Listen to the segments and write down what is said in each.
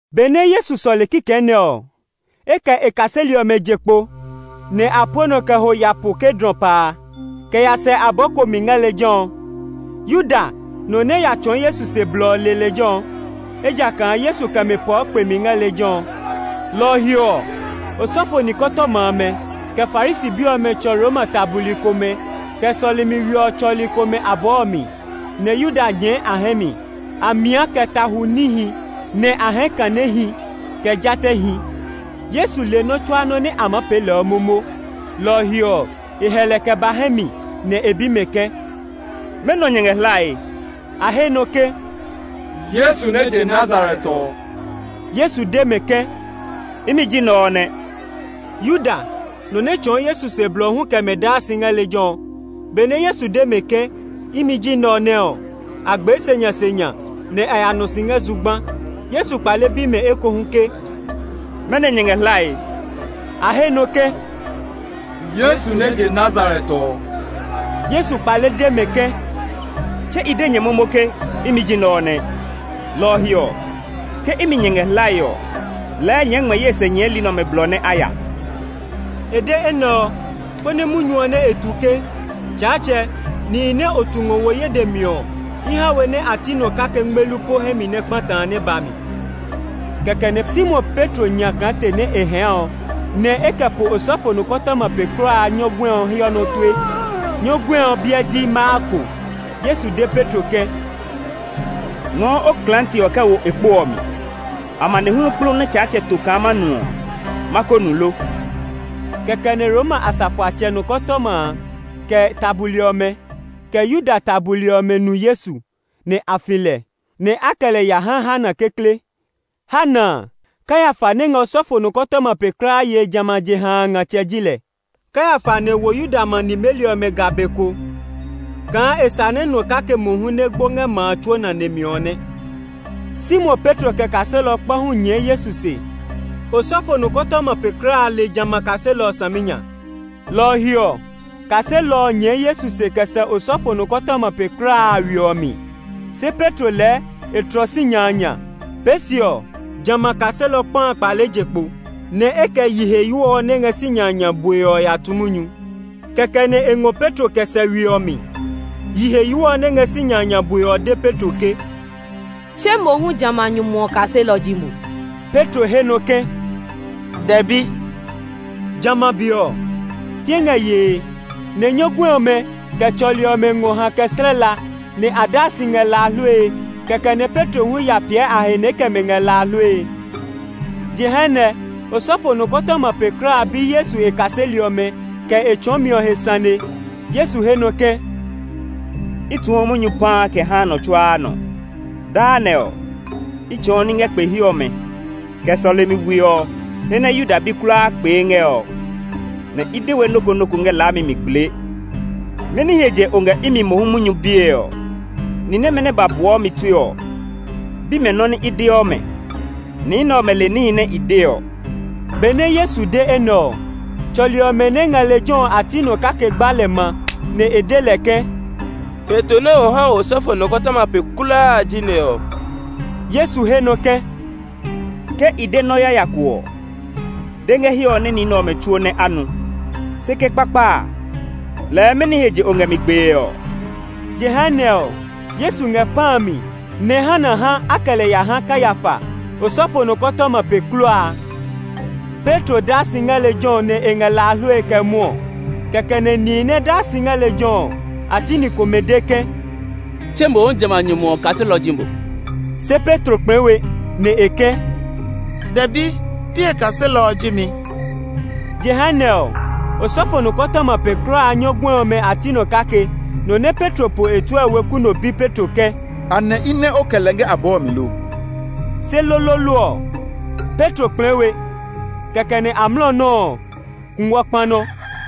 Benɛ Yesu sɔle kikɛ nɛ ɔ, e kɛ e kaseli ɔmɛ je kpo, nɛ a pue nɔ kɛ ho ya po Kedron pa a, kɛ ya sɛ abɔɔ ko mi ngɛ lejɛ ɔ. Yuda, nɔ nɛ ya tsɔɔ Yesu se blɔ ɔ le lejɛ ɔ, ejakaa Yesu kɛ mɛ pɔɔ kpemi ngɛ lejɛ ɔ. Lɔ ɔ he ɔ, osɔfo nikɔtɔma amɛ, kɛ Farisi bi ɔmɛ tsɔ Roma ta buli komɛ, kɛ sɔlemi we ɔ tsɔli komɛ abɔɔ ɔ mi, nɛ Yuda nyɛɛ a hɛ mi. A dla a he kaa nihi nɛ yaa ta, nɛ a hɛɛ kanehi, kɛ jatɛhi. Yesu le nɔ́ tsuaa nɔ́ nɛ a maa pee lɛ ɔ momo; lɔ ɔ he ɔ, e hɛ lɛ kɛ ba hɛ mi nɛ e bi mɛ ke, “Mɛnɔ nyɛ ngɛ hlae?” A he nɔ ke, “Yesu nɛ je Nazaret ɔ.” Yesu de mɛ ke, “Imi ji nɛ ɔ nɛ!” Yuda, nɔ nɛ tsɔɔ Yesu se blɔ ɔ hu kɛ mɛ daa si ngɛ lejɛ ɔ. Benɛ Yesu de mɛ ke, “Imi ji nɛ ɔ nɛ” ɔ, a gbee senyasenya, nɛ a ya nɔ si ngɛ zugba. Yesu kpale bi mɛ ekohu ke, “Mɛnɔ nyɛ ngɛ hlae?” A he nɔ ke, “Yesu nɛ je Nazaret ɔ.” Yesu kpale de mɛ ke, “Tse i de nyɛ momo ke, ‘Imi ji nɛ ɔ nɛ.’ Lɔ ɔ he ɔ, ke imi nyɛ ngɛ hlae ɔ, lɛɛ nyɛɛ ngmɛ ye se nyɛɛli nɛ ɔmɛ blɔ nɛ a ya.” E de enɛ ɔ, konɛ munyu ɔ nɛ e tu ke, “Tsaatsɛ, nihi nɛ o tu ngɔ wo ye dɛ mi ɔ, i ha we nɛ a ti nɔ kake ngmelu po hɛ mi nɛ kpata” a, nɛ ba mi. Kɛkɛ nɛ Simon Petro nyla klaate nɛ e hɛɛ ɔ, nɛ e kɛ po osɔfo nɔkɔtɔma pe kulaa a nyɔguɛ ɔ hiɔ nɔ tue. Nyɔguɛ ɔ biɛ ji Malko. Yesu de Petro ke, “Ngɔɔ o klaate ɔ kɛ wo e kpo ɔ mi. Amanehlu kplu nɛ Tsaatsɛ to kaa ma nu ɔ, ma ko nu lo?” Kɛkɛ nɛ Roma asafoatsɛ nɔkɔtama a, kɛ e ta buli ɔmɛ, kɛ Yuda ta buli ɔmɛ nu Yesu, nɛ a fi lɛ, nɛ a kɛ lɛ ya ha Hana kekle. Hana a, Kayafa nɛ ngɛ osɔfo nɔkɔtɔma pe kulaa yee jamɛ a jeha a ngatsɛ ji lɛ. Kayafa nɛ wo Yuda ma nimeli ɔmɛ ga be ko kaa e sa nɛ nɔ kake mohu nɛ gbo ngɛ ma a tsuo nane mi ɔ nɛ. Simon Petro kɛ kaselɔ kpa hu nyɛɛ Yesu se. Osɔfo nɔkɔtɔma pe kulaa a le jamɛ a kaselɔ ɔ saminya, lɔ ɔ he ɔ, kaselɔ ɔ nyɛɛ Yesu se kɛ sɛ osɔfo nɔkɔtɔma pe kulaa a we ɔ mi; se Petro lɛɛ e tlɔ sinya a nya. Pee se ɔ, jamɛ a kaselɔ kpa a kpale je kpo, nɛ e kɛ yiheyo ɔ nɛ ngɛ sinya a nya bue ɔ ya tu munyu, kɛkɛ nɛ e ngɔ Petro kɛ sɛ we ɔ mi. Yiheyo ɔ nɛ ngɛ sinya a nya bue ɔ de Petro ke, “Tse mo hu jamɛ a nyumu ɔ kaselɔ ji mo?” Petro he nɔ ke, “Dɛbi.” Jamɛ a be ɔ, fĩɛ ngɛ yee, nɛ nyɔguɛ ɔmɛ, kɛ tsɔli ɔmɛ ngɔ hã kɛ slɛ la, nɛ a daa si ngɛ la a hlue. Kɛkɛ nɛ Petro hu ya piɛ a he nɛ e kɛ mɛ ngɛ la a hlue. Jehanɛ osɔfo nɔkɔtɔma pe kulaa a bi Yesu e kaseli ɔmɛ, kɛ e tsɔɔmi ɔ he sane. Yesu he nɔ ke, “I tuɔ munyu paa kɛ haa nɔ tsuaa nɔ. Daa nɛ ɔ, i tsɔɔ ní ngɛ kpe he ɔmɛ, kɛ sɔlemi we ɔ he nɛ Yuda bi kulaa kpee ngɛ ɔ, nɛ i de we nɔ́ ko nɔ́ ko ngɛ laami mi gblee. Mɛni he je o ngɛ imi mohu munyu bie ɔ Ni nɛmɛ nɛ ba buɔ mi tue ɔ, bi mɛ nɔ́ nɛ i deɔ mɛ. Ni nɛ ɔmɛ le níhi nɛ i de ɔ.” Benɛ Yesu de enɛ ɔ, tsɔli ɔmɛ nɛ ngɛ lejɛ ɔ a ti nɔ kake gba lɛ ma, nɛ e de lɛ ke, “Heto nɛ o ha osɔfo nɔkɔtɔma pe kulaa a ji nɛ ɔ?” Yesu he nɔ ke, “Ke i de nɔ yaya ko ɔ, de ngɛ hiɛ ɔ nɛ ni nɛ ɔmɛ tsuo nɛ a nu. Se ke kpakpa a, lɛɛ mɛni he je o ngɛ mi gbee ɔ?” Jehanɛ ɔ, Yesu ngɛ pã a mi, nɛ Hana ha a kɛ lɛ ya ha Kayafa, osɔfo nɔkɔtɔma pe kulaa a. Petro daa si ngɛ lejɛ ɔ nɛ e ngɛ la a hlue kɛ mwɔɔ. Kɛkɛ nɛ nihi nɛ daa si ngɛ lejɛ ɔ, a ti ni komɛ de ke, “Tse mohu jamɛ a nyumu ɔ kaselɔ ji mo.” Se Petro kplɛɛ we, nɛ e ke, “Dɛbi, pi e kaselɔ ji mi.” Jehanɛ ɔ, osɔfo nɔkɔtɔma pe kulaa a nyɔguɛ ɔmɛ a ti nɔ kake, nɔ nɛ Petro po e tue ɔ weku no bi Petro ke, “Anɛ i nɛ o kɛ lɛ ngɛ abɔɔ ɔ mi lo?” Se loloolo ɔ, Petro kplɛɛ we, kɛkɛ nɛ amlɔ nɔuu kungwɔ kpa nɔ.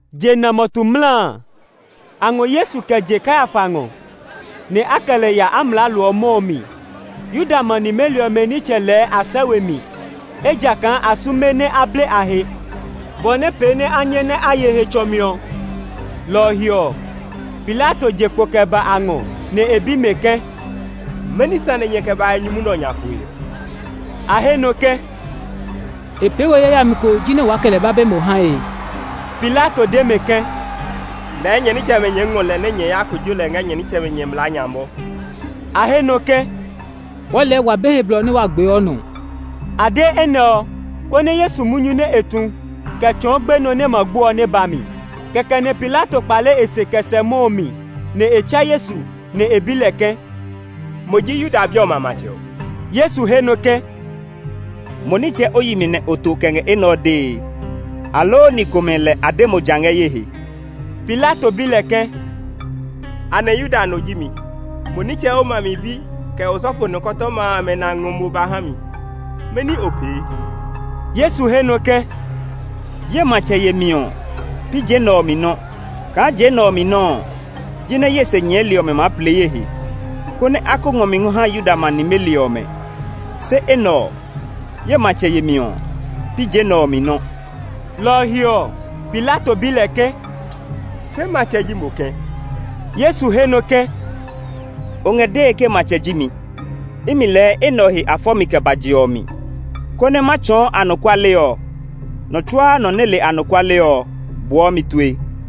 Jena mɔtu mla a, a ngɔ Yesu kɛ je Kayafa ngɔ, nɛ a kɛ lɛ ya amlaalo ɔ mɔ ɔ mi. Yuda ma nimeli ɔmɛ nitsɛmɛ lɛɛ a sɛ we mi, ejakaa a sume nɛ a ble a he, bɔ nɛ pee nɛ a nyɛ nɛ a ye Hetsɔmi ɔ. Lɔ ɔ he ɔ, Pilato je kpo kɛ ba a ngɔ, nɛ e bi mɛ ke, “Mɛni sane nyɛ kɛ ba ngɛ nyumu nɛ ɔ nya poe ɔ?” A he nɔ ke, “E pee we yayami ko jinɛ waa kɛ lɛ ba be mo hae.” Pilato de mɛ ke, “Lɛɛ nyɛ nitsɛmɛ nyɛɛ ngɔ lɛ nɛ nyɛ ya kojo lɛ ngɛ nyɛ nitsɛmɛ nyɛ mlaa nya mɔ.” A he nɔ ke, “Wɔɔ lɛɛ wa be he blɔ nɛ wa gbeɔ nɔ.” A de enɛ ɔ, konɛ Yesu munyu nɛ e tu kɛ tsɔɔ gbenɔ nɛ e ma gbo ɔ nɛ ba mi. Kɛkɛ nɛ Pilato kpale e se kɛ sɛ mɔ ɔ mi, nɛ e tsɛ Yesu, nɛ e bi lɛ ke, “Mo ji Yuda bi ɔmɛ a matsɛ ɔ?” Yesu he nɔ ke, “Mo nitsɛ o yi mi nɛ o to kɛ ngɛ enɛ ɔ dee, aloo ni komɛ lɛ a de mo ja ngɛ ye he?” Pilato bi lɛ ke, “Anɛ Yuda no ji mi? Mo nitsɛ o ma mi bi, kɛ osɔfo nikɔtɔma amɛ nɛ a ngɔ mo ba ha mi. Mɛni o pee?” Yesu he nɔ ke, “Ye matsɛ yemi ɔ, pi je nɛ ɔ mi nɔ́. Kaa je nɛ ɔ mi nɔ́ ɔ, jinɛ ye se nyɛɛli ɔmɛ maa plee ye he, konɛ a ko ngɔ mi ngɔ ha Yuda ma nimeli ɔmɛ. Se enɛ ɔ, ye matsɛ yemi ɔ, pi je nɛ ɔ mi nɔ́.” Lɔ ɔ he ɔ, Pilato bi lɛ ke, “Se matsɛ ji mo kɛ̃?” Yesu he nɔ ke, “O ngɛ dee ke matsɛ ji mi. Imi lɛɛ enɛ ɔ he nɛ a fɔ mi kɛ ba je ɔ mi, konɛ ma tsɔɔ anɔkuale ɔ. Nɔ tsuaa nɔ nɛ le anɔkuale ɔ buɔ mi tue.”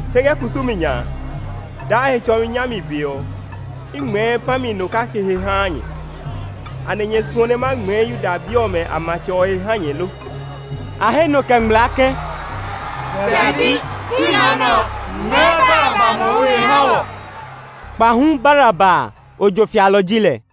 Se ngɛ kusumi nya a, daa Hetsɔmi nyami be ɔ, i ngmɛɛ pã mi no kake he haa nyɛ. Anɛ nyɛ suɔ nɛ ma ngmɛɛ Yuda bi ɔmɛ a matsɛ ɔ he ha nyɛ lo?” A he nɔ kɛ ngmlaa ke, “Dɛbi! Pi nɔ nɛ ɔ; ngmɛɛ Baraba mohu he ha wɔ.” Kpahu Baraba a, ojo fialɔ ji lɛ.